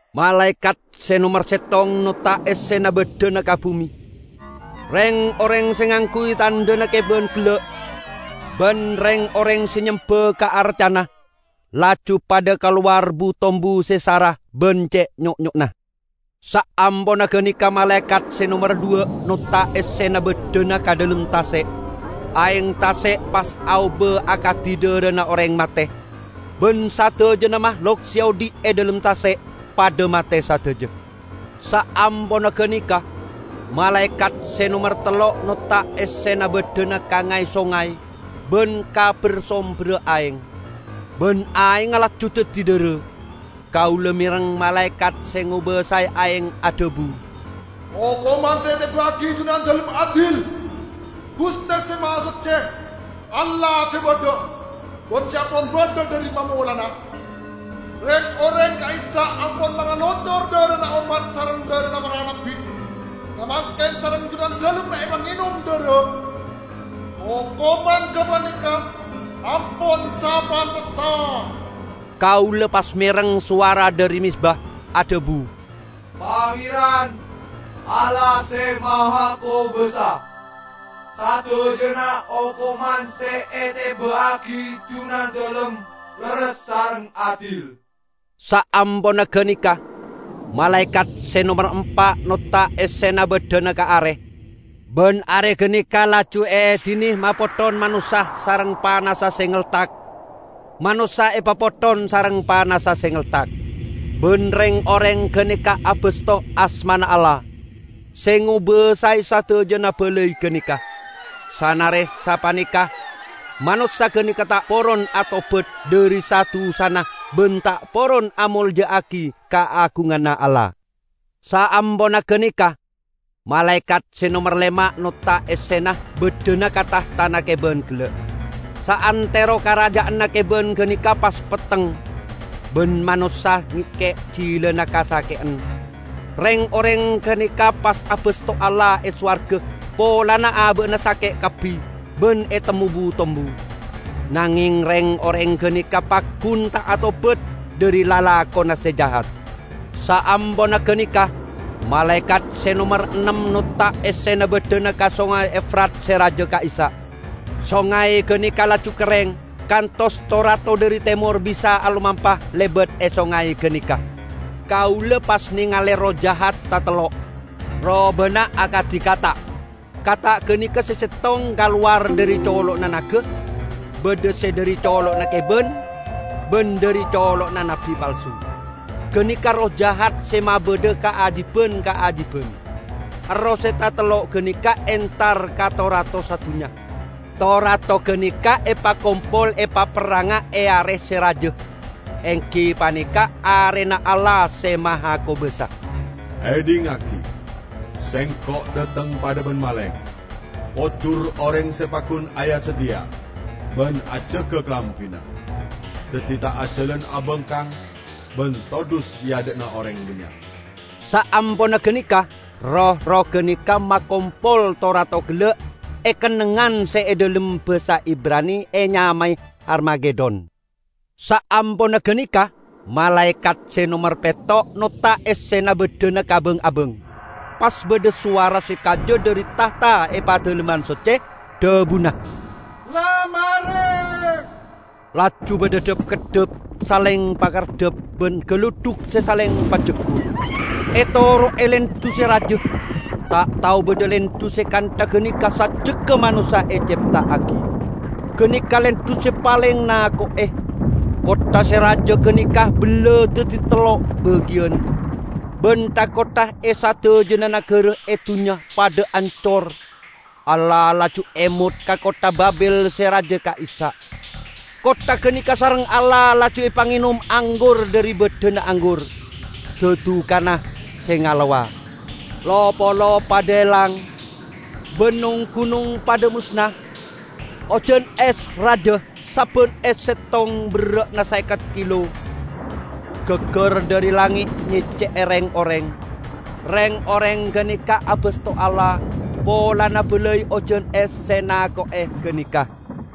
Malaekat se nomer settong notta' essena baddhana ka bume. Reng-oreng se ngangguy tandhana keban gella', ban reng-oreng se nyemba ka arcana, laju padha kalowar bu-tombu se sara ban ce' nyo'nyo'na. Saamponna ganeka malaekat se nomer dhuwa' notta' essena baddhana ka dhalem tase'. Aeng tase' pas aoba akadi dharana oreng mate, ban sadajana mahlok se odhi' e dhalem tase' padha mate sadaja. Saamponna ganeka malaekat se nomer tello' notta' essena baddhana ka ngay-songay ban ka ber-somberra aeng, ban aengnga laju daddi dhara. Kaula mereng malaekat se ngobasae aeng adhabu, "Okoman se eteba'agi Junandalem adil, Guste Se Mahasocce, Allah se badha, ban se ampon badha dhari mamolanna! Reng-oreng ka'issa' ampon mangalocor dharana ommat sareng dharana para nabbi; samangken sareng Junandalem epangenom dhara. Okoman gapaneka ampon sapantessa!" Kaula pas mereng sowara dhari mezba adhabu, "Pangeran, Allah Se Mahakobasa, sadajana okoman se eteba'agi Junandalem lerres sareng adil!" Saamponna ganeka malaekat se nomer empa' notta' essena baddhana ka are, ban are ganeka laju eedine mapotthon manossa sareng panassa se ngeltak. Manossa epapotthon sareng panassa se ngeltak, ban reng-oreng ganeka abasto asmana Allah, se ngobasae sadajana balai ganeka. Sanare sapaneka, manossa ganeka ta' poron atobat dhari sa-dusana ban ta' poron amolja'agi kaagunganna Allah. Saamponna ganeka malaekat se nomer lema' notta' essena baddhana ka tahtana keban gella'. Saantero karaja'anna keban ganeka pas petteng, ban manossa ngekke' jilana kasake'en. Reng-oreng ganeka pas abasto Allah e sowarga polana aba'na sake' kabbi ban etemmo bu-tombu. Nangeng reng-oreng ganeka paggun ta' atobat dhari lalakonna se jahat. Saamponna ganeka malaekat se nomer ennem notta' essena baddhana ka Songay Efrat se raja ka'issa'. Songay ganeka laju kerreng, kantos to-rato dhari temor bisa alomampa lebat e songay ganeka. Kaula pas nengale erroh jahat tatello', robana akadi kata'. Kata' ganeka se settong kalowar dhari colo'na naga, badha se dhari colo'na keban, ban dhari colo'na nabbi palsu. Ganeka erroh jahat se mabadha kaajiban-kaajiban. Erroh se tatello' ganeka entar ka to-rato sadunnya; to-rato ganeka epakompol epaperranga e Are se raja, enggi paneka Arena Allah Se Mahakobasa. "Edhingngagi! Sengko' dhateng padha ban maleng! Pojur oreng se paggun aya-sadhiya ban ajaga kalambina, daddi ta' ajalan abangkang ban todhus e adha'na oreng bannya'." Saamponna ganeka roh-erroh ganeka makompol to-rato gella e kennengngan se e dhalem basa Ibrani enyamae Harmagedon. Saamponna ganeka malaekat se nomer petto' notta' essena baddhana ka bang-abang. Pas badha sowara se kaja dhari tahta e Padalemman Socce, dhabuna, "La mare!" Laju badha dhap-keddhap saleng pakareddhap ban galudhuk saleng pajaggur, etoro'e lendhu se raja. Ta' tao badha lendhu se kantha ganeka sajjegga manossa ecepta'agi. Ganeka lendhu se paleng nako'e! Kottha se raja ganeka bella daddi tello bagiyan, ban tha-kottha e sadajana nagara e dunnya padha ancor. Allah laju emot ka kottha Babil se raja ka'issa'. Kottha ganeka sareng Allah laju epangenom anggur dhari baddhana anggur -- dadukanna se ngalowa. Lo-polo padha elang, ban nong-gunong padha mosna. Ojan es raja, sabban es settong berra'na saeket kilo, gaggar dhari langnge' nyecce'e reng-oreng. Reng-oreng ganeka abasto Allah polana balai ojan es se nako'e ganeka.